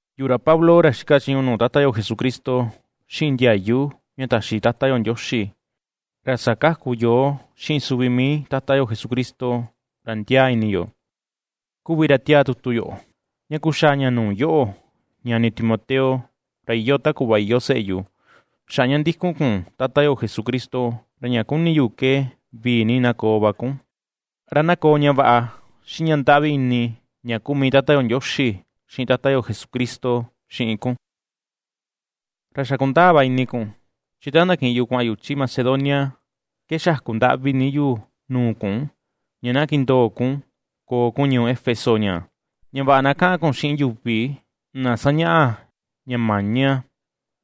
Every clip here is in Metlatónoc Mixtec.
Yuꞌu, ra Pablo, ra xika chiñu nuu Tata yo Jesucristo, xiꞌin ndiayu ña taxi Tata yo Ndioxi ra sakaku yoo xiꞌin suvi mii Tata yo Jesucristo ra ndiaa ini yo, kuvi ra ^tiaa tutu yo ña kuxaa ña nuu yoꞌo, ñani Timoteo, ra iyoo ta kuꞌva iyoo seꞌe yu, xaꞌa ña ndikun kun Tata yo Jesucristo, ra ña kuni yu ke vii ni na koo va kun, ra na koo ña vaꞌa xiꞌin ña ndaꞌvi ini ña kuu mii Tata yo Ndioxi xiꞌin Tata yo Jesucristo xiꞌin kun. Ra xa kundaa va ini kun, chi ta ndakiꞌin yu kuaꞌan yu chi Macedonia ke xaku ndaꞌvi ni yu nuu kun, ña na kindoo kun koo kun ñuu Éfeso ñaa, ña vaꞌa na kaꞌan kun xiꞌin yuvi na sañaꞌa ña maña,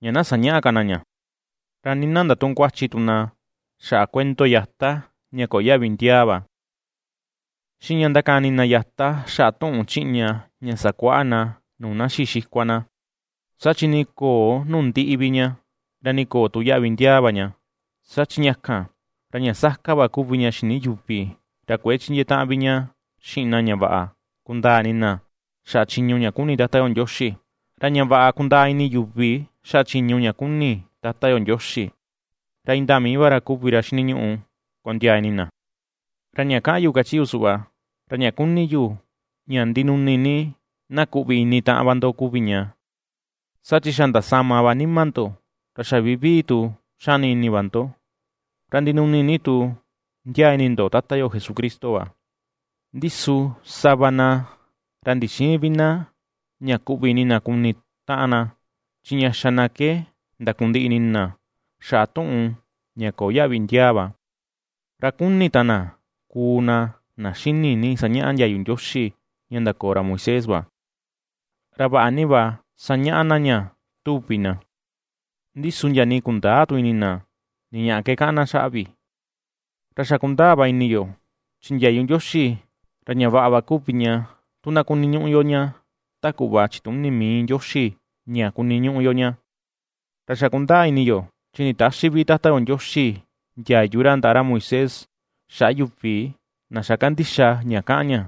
ña na sañäꞌa ka na ña, ra nii na ndatüꞌun kuachi ni tu na xaꞌa kuento yata ña köo yaꞌvi ndiaa va, xiꞌin ña ndakani na yata xaꞌa tuꞌun chiꞌña ña sakuaꞌa na nuu na xii xikua na, saa chi ni köo nuu ndiꞌi vi ña, ra nii köo tu yaꞌvi ndiaa va ña, saa chi ña kan, ra ña saka va kuvi ña xini yuvi ra kuëe chindiee taꞌan vi ña xiꞌin na ña vaꞌa kundaa ini na xaꞌa chiñu ña kuni Tata yo Ndioxi; ra ña vaꞌa kundaa ini yuvi xaꞌa chiñu ña kuni Tata yo Ndioxi ra indaa mii va ra kuvi ra xiniñuꞌu kondiaa ini na. Ra ña kaꞌan yu kachi yu suꞌva, ra ña kuni yu ña ndinuni ni na kuꞌvi ini taꞌan va ndo kuvi ña, saa chi xa ndasama va nima ndo, ra xa vivii tu ^xani ini va ndo, ra ndinuni ni tu ndiaa ini ndo Tata yo Jesucristo va. Ndi su sava na ra ndixïin vi na ña kuꞌvi ini na kuni taꞌan na, chi ña xa na ke ndakundiꞌi ini na xaꞌa tuꞌun ña köo yaꞌvi ndiaa va. Ra kuni ta na kuu na na xini ni sañaꞌa ndiayu Ndioxi ña ndakoo ra Moisés va, ra vaꞌa ni va sañaꞌa na ña tuvi na, ndi su ndia nii kundäa tu ini na ni ñaꞌa ke kaꞌan na xaꞌa vi. Ra xa kundaa va ini yo chi ndiayu Ndioxi ra ña vaꞌa va kuvi ña, tu na kuniñuꞌu yo ña ta kuꞌva chituni mii Ndioxi ña kuniñuꞌu yo ña. Ra xa kundaa ini yo chi nditäxi vi Tata yo Ndioxi ndiayu ra ndaꞌa ra Moisés xaꞌa yuvi na xa kandixa ña kaꞌan ña,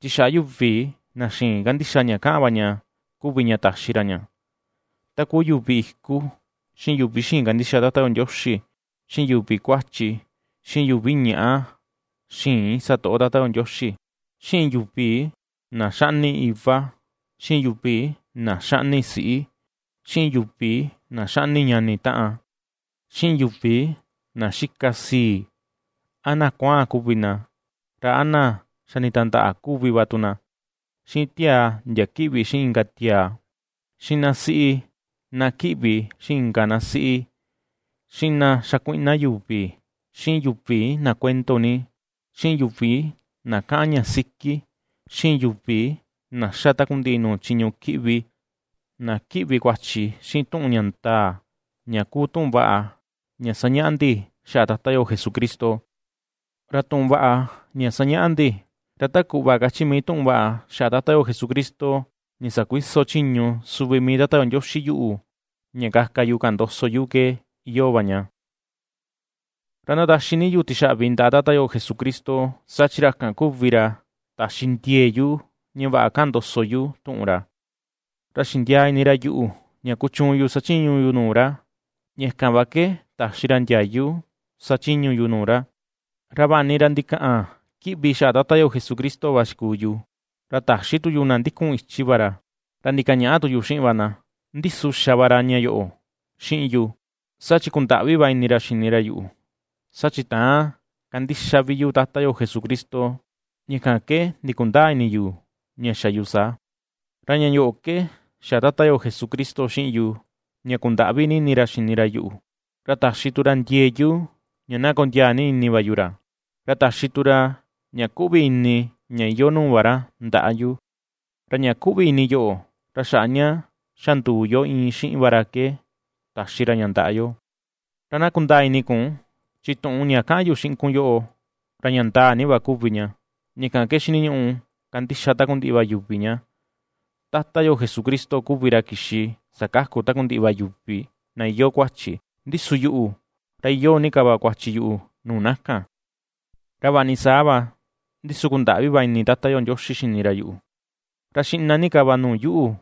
chi xaꞌa yuvi na xïin kandixa ña kaꞌan va ña kuvi ña taxi ra ña. Ta kuu yuvi iku, xiꞌin yuvi xïin kandixa Tata yo Ndioxi, xiꞌin yuvi kuachi, xiꞌin yuvi ñaꞌa xïin satoꞌo Tata yo Ndioxi, xiꞌin yuvi na xaꞌni iva, xiꞌin yuvi na xaꞌni siꞌi, xiꞌin yuvi na xaꞌni ñani taꞌan, xiꞌin yuvi na xika sii, a na kuaan kuvi na, ra a na xa nditandaꞌa kuvi va tu na, xiꞌin tiaa ndia kiꞌvi xiꞌin inka tiaa, xiꞌin na siꞌi na kiꞌvi xiꞌin inka na siꞌi, xiꞌin na xakuiꞌna yuvi, xiꞌin yuvi na kuendo ni, xiꞌin yuvi na kaꞌan ña siki, xiꞌin yuvi na ^xa takundiꞌi nuu chiñu kiꞌvi, na kiꞌvi kuachi xiꞌin tuꞌun ña ndaa, ña kuu tuꞌun vaꞌa ña sañaꞌa ndi xaꞌa Tata yo Jesucristo. Ra tuꞌun vaꞌa ña sañaꞌa ndi, ra ta kuꞌva kachi mii tuꞌun vaꞌa xaꞌa Tata yo Jesucristo ña sakuiso chiñu suvi mii Tata yo Ndioxi yuꞌu ña kaka yu kaꞌan ndoso yu ke iyoo va ña. Ra ndataxi ni yu tixaꞌvi ndaꞌa Tata yo Jesucristo, saa chi ra kan kuvi ra taxi ndiee yu ña vaꞌa kaꞌan ndoso yu tuꞌun ra, ra xindiaa ini ra yuꞌu ña kuchuun yu sachiñu yu nuu ra, ña kan va ke taxi ra ndiayu sachiñu yu nuu ra. Ra vaꞌa ni ra ndikaꞌan kiꞌvi xaꞌa Tata yo Jesucristo va xikuu yu, ra ta̱xí tu yu na ndikun ichi va ra, ra ndikañaꞌa tu yu xiꞌin va na. Ndi su xa va ra ña vaꞌa yoꞌo xiꞌin yu, saa chi kundaꞌvi va ini ra xini ra yuꞌu, saa chi täan kandixa vi yu Tata yo Jesucristo, ña kan ke ndikundäa ini yu ña xa yu saa. Ra ña yoꞌo ke xa Tata yo Jesucristo xiꞌin yu ña kundaꞌvi ni ini ra xini ra yuꞌu, ra taxi tu ra ndiee yu ña na kondiaa ni ini va yu ra, ra taxi tu ra ña kuꞌvi ini ña iyoo nuu va ra ndaꞌa yu, ra ña kuꞌvi ini yoꞌo ra xaꞌa ña xa nduu yo iin xiꞌin va ra ke taxi ra ña ndaꞌa yo. Ra na kundaa ini kun chi tuꞌun ña kaꞌan yu xiꞌin kun yoꞌo, ra ña ndaa ni va kuvi ña, ña kan ke xiniñuꞌu kandixa takundiꞌi va yuvi ña: Tata yo Jesucristo kuvi ra kixi sakaku takundiꞌi va yuvi na iyoo kuachi, ndi su yuꞌu, ra iyoo ni ka va kuachi yu nuu na kan. Ra vaꞌa ni saa va, ndi su kundaꞌvi va ini Tata yo Ndioxi xini ra yuꞌu, ra xiꞌna ni ka va nuu yuꞌu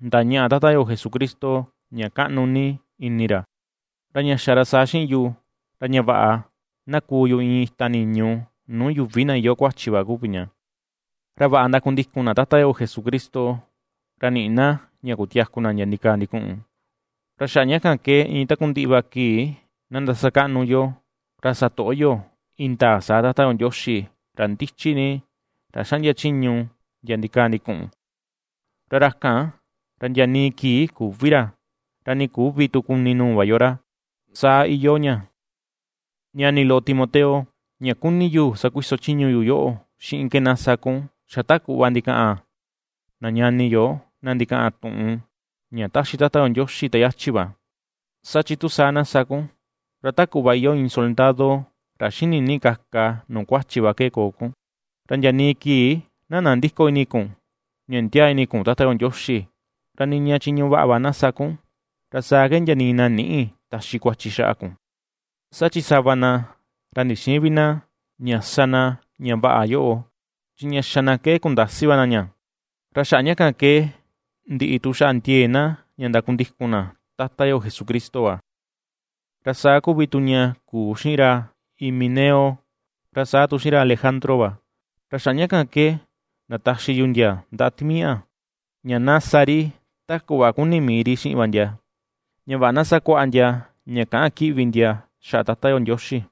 ndañaꞌa Tata yo Jesucristo ña kaꞌnu ni ini ra. Ra ña xa ra saa xiꞌin yu, ra ña vaꞌa na kuu yu iin ita niñu nuu yuvi na iyoo kuachi va kuvi ña, ra vaꞌa ndakundikun na Tata yo Jesucristo ra niꞌi na ña kutiaku na ndia ndikaa ndikuꞌun. Ra xaꞌa ña kan ke iin takundiꞌi va kii na ndasakaꞌnu yo, ra satoꞌo yo indaa saa Tata yo Ndioxi, ra ndichi ni, ra xaꞌndia chiñu ndia ndikaa ndikuꞌun, ra ra kan, ra ndia nii kii küvi ra, ra nii küvi tu kuni nuu va yo ra. Saa iyoo ña. Ñani loꞌo, Timoteo, ña kuni yu sakuiso chiñu yu yoꞌo xiꞌin ke na sa kun ^xa ta kuꞌva ndikaꞌan na ñani yo na ndikaꞌan tuꞌun ña ^Taxi Tata yo Ndioxi ta yachi va, saa chi tu saa na sa kun, ra ta kuꞌva iyoo iin soldado ra xini ni kaka nuu kuachi va ke koo kun. Ra ndia nii kii na nandïko ini kun ña ndiaa ini kun Tata yo Ndioxi, ra niña ña chiñu vaꞌa va na ^sa kun, ra saa ke ndia nii na nïꞌi taxi kuachi xaꞌa kun. Saa chi sava na, ra ndixïin vi na ña sa na ña vaꞌa yoꞌo, chi ña xa na ke kundasi va na ña, ra xaꞌa ña ke ndiꞌi tu xaꞌa ndiee na ña kundikun na Tata yo Jesucristo va. Ra saa kuvi tu ña kuu xiꞌin ra Himeneo, ra saa tu xiꞌin ra Alejandro va, ra xaꞌa ña kan ke ndataxi yu ndia ndaꞌa timiaꞌa, ña na sa ri ta kuꞌva kuni mii ri xiꞌin va ndia, ña vaꞌa na sakuaꞌa ndia ña käꞌan kiꞌvi ndia xaꞌa Tata yo Ndioxi.